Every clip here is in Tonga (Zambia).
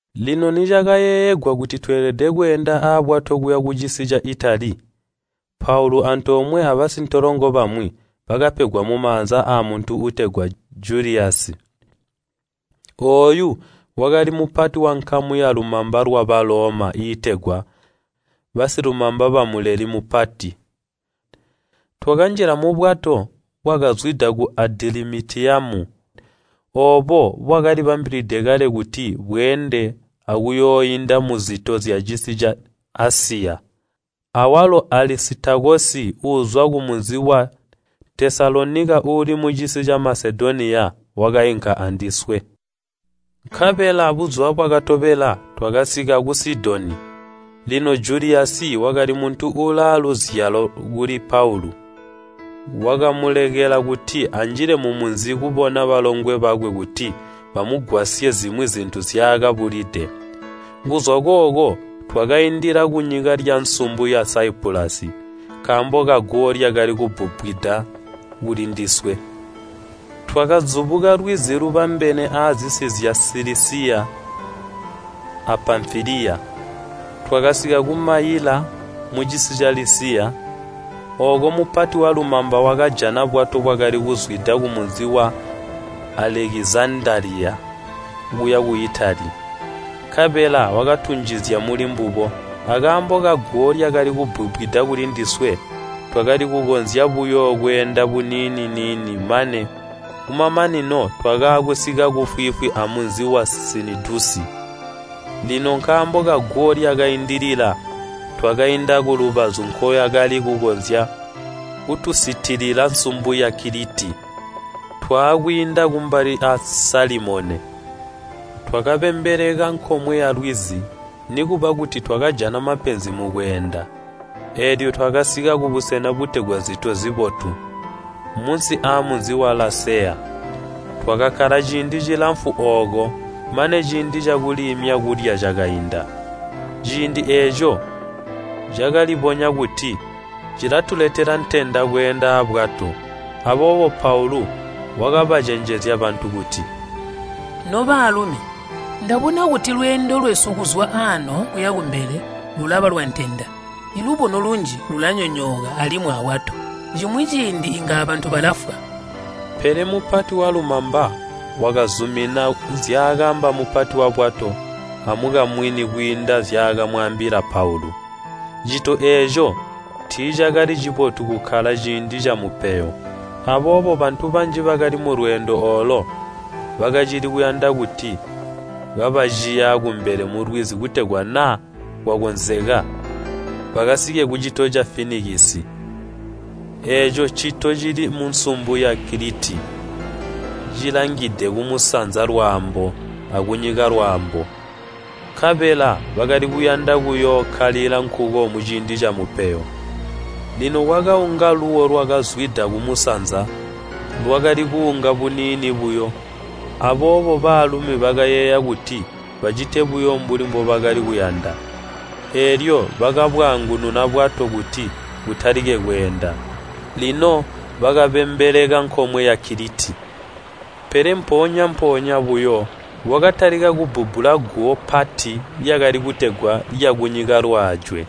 Lino nicakayeeyegwa kuti tweelede kweenda abwato kuya kucisi ca Itali, Paulu antoomwe abasintolongo bamwi bakapegwa mumaanza aamuntu uutegwa Juliyasi. Ooyu wakali mupati wankamu yalumamba lwa Baloma iitegwa “Basilumamba bamuleli mupati.” Twakanjila mubwato bwakazwida ku Adilamitiyamu oobo bwakali bambilide kale kuti bweende akuyooinda muzito zyacisi ca Asiya. Awalo Alisitakosi uuzwa kumunzi wa Tesalonika uuli mucisi ca Masedoniya, wakainka andiswe. Nkabela buzuba bwakatobela twakasika ku Sidoni. Lino Juliyasi wakali muntu uulaaluzyalo kuli Paulu, wakamulekela kuti anjile mumunzi kubona balongwe bakwe kuti bamugwasye zimwi zintu nzyaakabulide. Kuzwa kooko twakaindila kunyika lyansumbu ya Saipulasi nkaambo kaguwo lyakali kubbubbwida kuli ndiswe. Twakazubuka lwizi lubambene azisi zya Silisiya a Pamfiliya, twakasika ku Mayila, mucisi ca Lisiya. Ooko mupati walumamba wakajana bwato bwakali kuzwida kumunzi wa Alekizandaliya kuya ku Itali, nkabela wakatunjizya mulimbubo. Akaambo kaguwo lyakali kubbubbwida kuli ndiswe, twakali kukonzya buyo kweenda buniini-niini mane kumamanino twakaakusika kufwiifwi amunzi wa Sinidusi. Lino nkaambo kaguwo lyakaindilila, twakainda kulubazu nkoyakali kukonzya kutusutilila nsumbu ya Kiliti, twaakwiinda kumbali a Salimone. Twakabembeleka nkomwe yalwizi, nikuba kuti twakajana mapenzi mukweenda, eelyo twakasika kubusena butegwa Zito Zibotu, munsi amunzi wa Laseya. Twakakkala ciindi cilamfu ooko mane ciindi cakuliimya kulya cakainda. Ciindi eeco cakalibonya kuti cilatuletela ntenda kweenda abwato. Aboobo Paulu wakabacenjezya bantu kuti, “Nobaalumi, ndabona kuti lweendo lwesu kuzwa aano kuya kumbele lulaba lwantenda. Lubono lunji lulanyonyooka alimwi abwato, cimwi ciindi inga abantu balafwa.” Pele mupati walumamba wakazumina zyakaamba mupati wabwato amukamwini kwiinda nzyakamwaambila Paulu. Cito eeco tiicakali cibotu kukkala ciindi camupeyo, aboobo bantu banji bakali mulweendo oolo bakacili kuyanda kuti kabaciya kumbele mulwizi kutegwa naa kwakonzeka bakasike kucito ca Finikisi. Eeco ncito cili munsumbu ya Kiliti cilangide kumusanza-lwaambo akunyika-lwaambo, nkabela bakali kuyanda kuyookkalila nkuko muciindi camupeyo. Lino kwakaunga luuwo lwakazwida kumusanza, lwakali kuunga buniini buyo, aboobo baalumi bakayeeya kuti bacite buyo mbuli mbobakali kuyanda. Eelyo bakabwaangununa bwato kuti butalike kweenda, lino bakabembeleka nkomwe ya Kiliti. Pele mpoonya-mpoonya buyo kwakatalika kubbubbula guwo pati lyakali kutegwa “Lyakunyika-lwaajwe”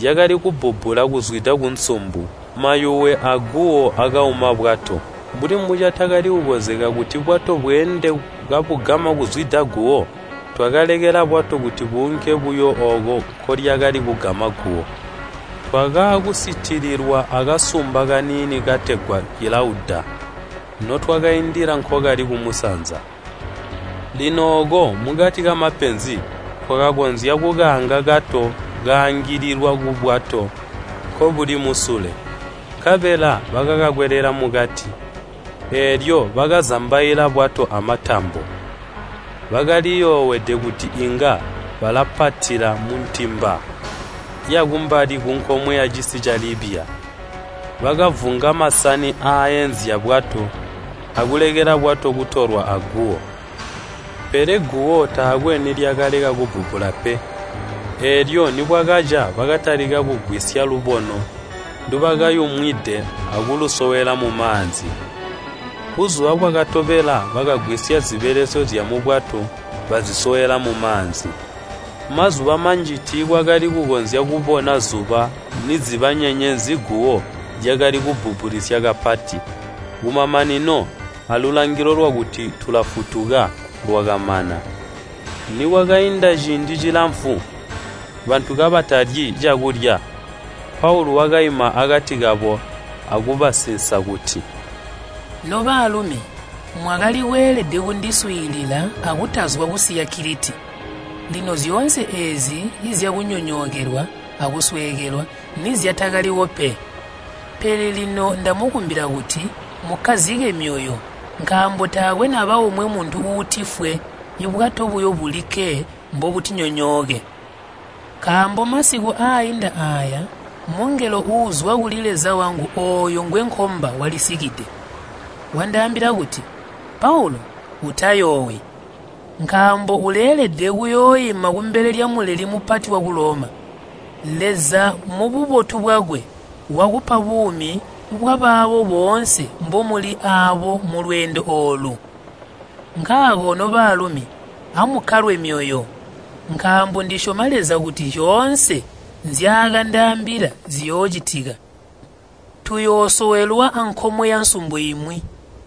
lyakali kubbubbula kuzwida kunsumbu. Mayuwe aaguwo akauma bwato. Mbuli mbocatakali kukonzeka kuti bwato bweende kabugama kuzwida guwo, twakalekela bwato kuti buunke buyo ooko nkolyakali kugama guwo. Twakaakusitililwa akasumba kaniini kategwa kilauda notwakaindila nkokali kumusanza. Lino ooko, mukati kamapenzi, twakakonzya kukaanga kato kaangililwa kubwato nkobuli musule. Nkabela bakakakwelela mukati, eelyo bakazambaila bwato amatambo. Bakaliyoowede kuti inga balapatila muntimba yakumbali kunkomwe yacisi ca Libya. Bakavunga masani aaenzya bwato akulekela bwato kutolwa aguwo. Pele guwo taakwe nilyakaleka kubbubbula pe, eelyo nibwakaca bakatalika kugwisya lubono ndubakayumwide akulusowela mumaanzi. Buzuba bwakatobela bakagwisya zibelesyo zyamubwato bazisowela mumaanzi. Mazuba manji tiitwakali kukonzya kubona zuba niziba nyenyezi guwo lyakacili kubbubbulisya kapati. Kumamanino, alulangilo lwakuti tulafutuka, lwakamana. Nikwakainda ciindi cilamfu, bantu kabatalyi cakulya, Paulu wakaima akati kabo akubasinsa kuti, “Nobaalumi, mwakali kweelede kundiswiilila akutazwa kusiya Kiliti, lino zyoonse eezi zyakunyonyookelwa akusweekelwa nizyataliwo pe. Pele lino ndamukumbila kuti, mukkazike myoyo nkaambo taakwe naba omwe muntu uutifwe, bwato buyo bulikke mbobutinyonyooke. Nkaambo masiku aainda aaya mungelo uuzwa kuli Leza wangu ooyo ngwenkomba walisikide. Wandaambila kuti, ‘Paulu, utayoowi! Nkaambo uleelede kuyooima kumbele lya Muleli Mupati waku Loma. Leza mububotu bwakwe, wakupa buumi bwabaabo boonse mbomuli aabo mulweendo oolu.’ Nkaako nobaalumi, amukkalwe myoyo! Nkaambo ndisyoma Leza kuti zyoonse nzyaandaambila ziyoocitika. Tuyoosowelwa ankomwe yansumbu imwi.”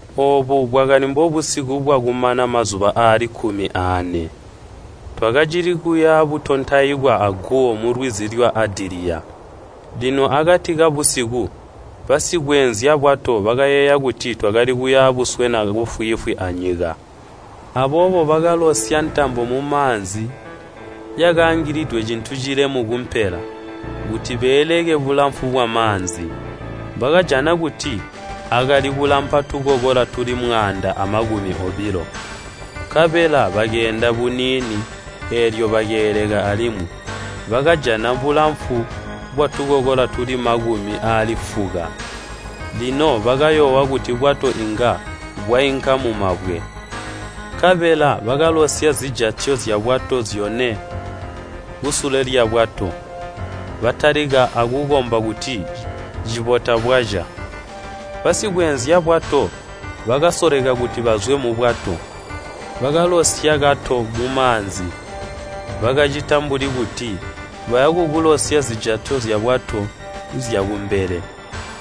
Oobu bwakali mbobusiku bwakumana mazuba aali kkumi aane, twakacili kuya butontaikwa aguwo mulwizi lwa Adiliya. Lino akati kabusiku, basikweenzya bwato bakayeeya kuti twakali kuya buswena kufwiifwi anyika. Aboobo bakalosya ntambo mumaanzi yakaangilidwe cintu cilemu kumpela, kuti beeleke bulamfu bwamaanzi. Bakajana kuti akali kulampa tukokola tuli mwaanda amakumi obilo. Nkabela bakeenda buniini, eelyo bakeeleka alimwi, bakajana bulamfu bwatukokola tuli makumi aali fuka. Lino bakayoowa kuti bwato inga bwainka mumabwe, nkabela bakalosya zijatyo zyabwato zyone kusule lyabwato, batalika akukomba kuti cibota bwaca. Basikweenzya bwato bakasoleka kuti bazwe mubwato, bakalosya kato mumaanzi, bakacita mbuli kuti baya kukulosya zijatyo zyabwato zyakumbele.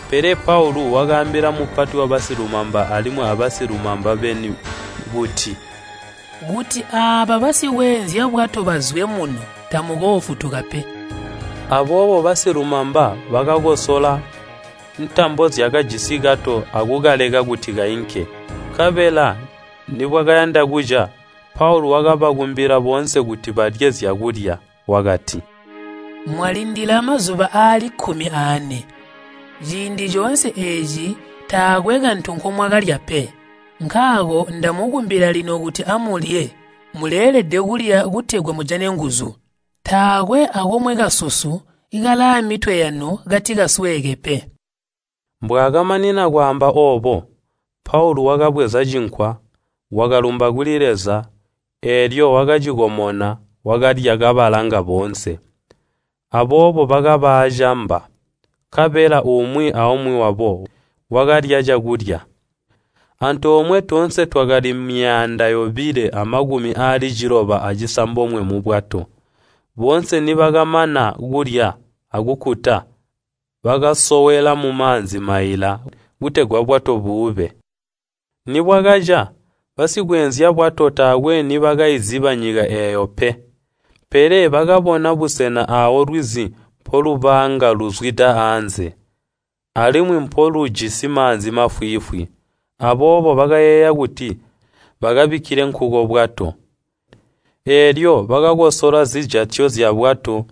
Pele Paulu wakaambila mupati wabasilumamba alimwi abasilumamba beni kuti, “Kuti aaba basikweenzya bwato bazwe muno tamukoofutuka pe.” Aboobo basilumamba bakakosola ntambo zyakajisi kato akukalekela kuti kainke. Nkabela nibwakayanda kuca, Paulu wakabakumbila boonse kuti balye zyakulya. Wakati, “Mwalindila mazuba aali kkumi aane, ciindi coonse eeci taakwe kantu komwakalya pe. Nkaako ndamukumbila lino kuti amulye, muleelede kulya kutegwa mujane nguzu. Taakwe akomwe kasusu kalaamitwe yanu kati kasweeke pe.” Mbwaakamanina kwaamba oobo, Paulu wakabweza cinkwa, wakalumba kuli Leza, eelyo wakacikomona, wakalya kabalanga boonse. Aboobo bakaba aacamba, nkabela umwi aumwi wabo wakalya cakulya. Antoomwe toonse twakali myaanda yobilo amakumi aali ciloba acisambomwe mubwato. Boonse nibakamana kulya akukkuta, bakasowela mumaanzi maila, kutegwa bwato buube. Nibwakaca, basikweenzya bwato taakwe nibakaiziba nyika eeyo pe, pele bakabona busena aawo lwizi mpolubaanga luzwida aanze, alimwi mpolujisi maanzi mafwiifwi, aboobo bakayeeya kuti bakabikkile nkuko bwato. Eelyo bakakosola zijatyo zyabwato,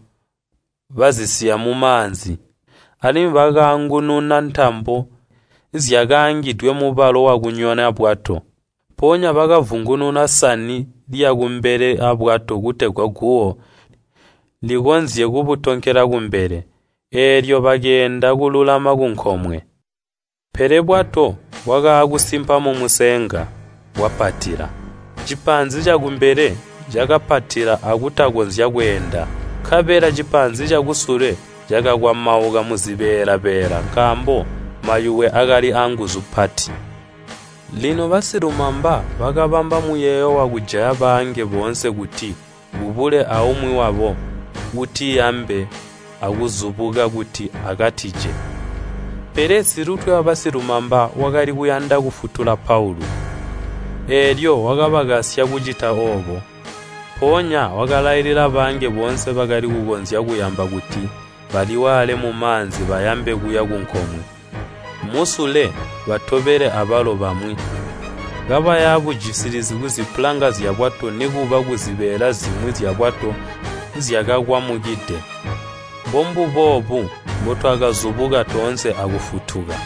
bazisiya mumaanzi, alimwi bakaangununa ntambo zyakaangidwe mubalo wakunyona bwato. Mpoonya bakavungununa sani lyakumbele aabwato kutegwa guwo likonzye kubutonkela kumbele, eelyo bakeenda kululama kunkomwe. Pele bwato bwakaakusimpa mumusenga, bwapatila. Cipaanzi cakumbele cakapatila akutakonzya kweenda, nkabela cipaanzi cakusule cakakwamauka muzibeela-beela nkaambo mayuwe aakali aanguzu mpati. Lino Basilumamba bakabamba muyeeyo wakujaya baange boonse kuti kubule aumwi wabo uuti yambe akuzubuka kuti akatije. Pele mupati wabasilumamba wakali kuyanda kufutula Paulu, eelyo wakabakasya kucita oobo. Mpoonya wakalailila baange boonse bakali kukonzya kuyamba kuti baliwaale mumaanzi bayambe kuya kunkomwe. Musule batobele abalo bamwi, kabaya bujisilizi kuzipulanga zyabwato nikuba kuzibeela zimwi zyabwato zyakakwamukide. Mbombuboobu mbutwakazubuka toonse akufutuka.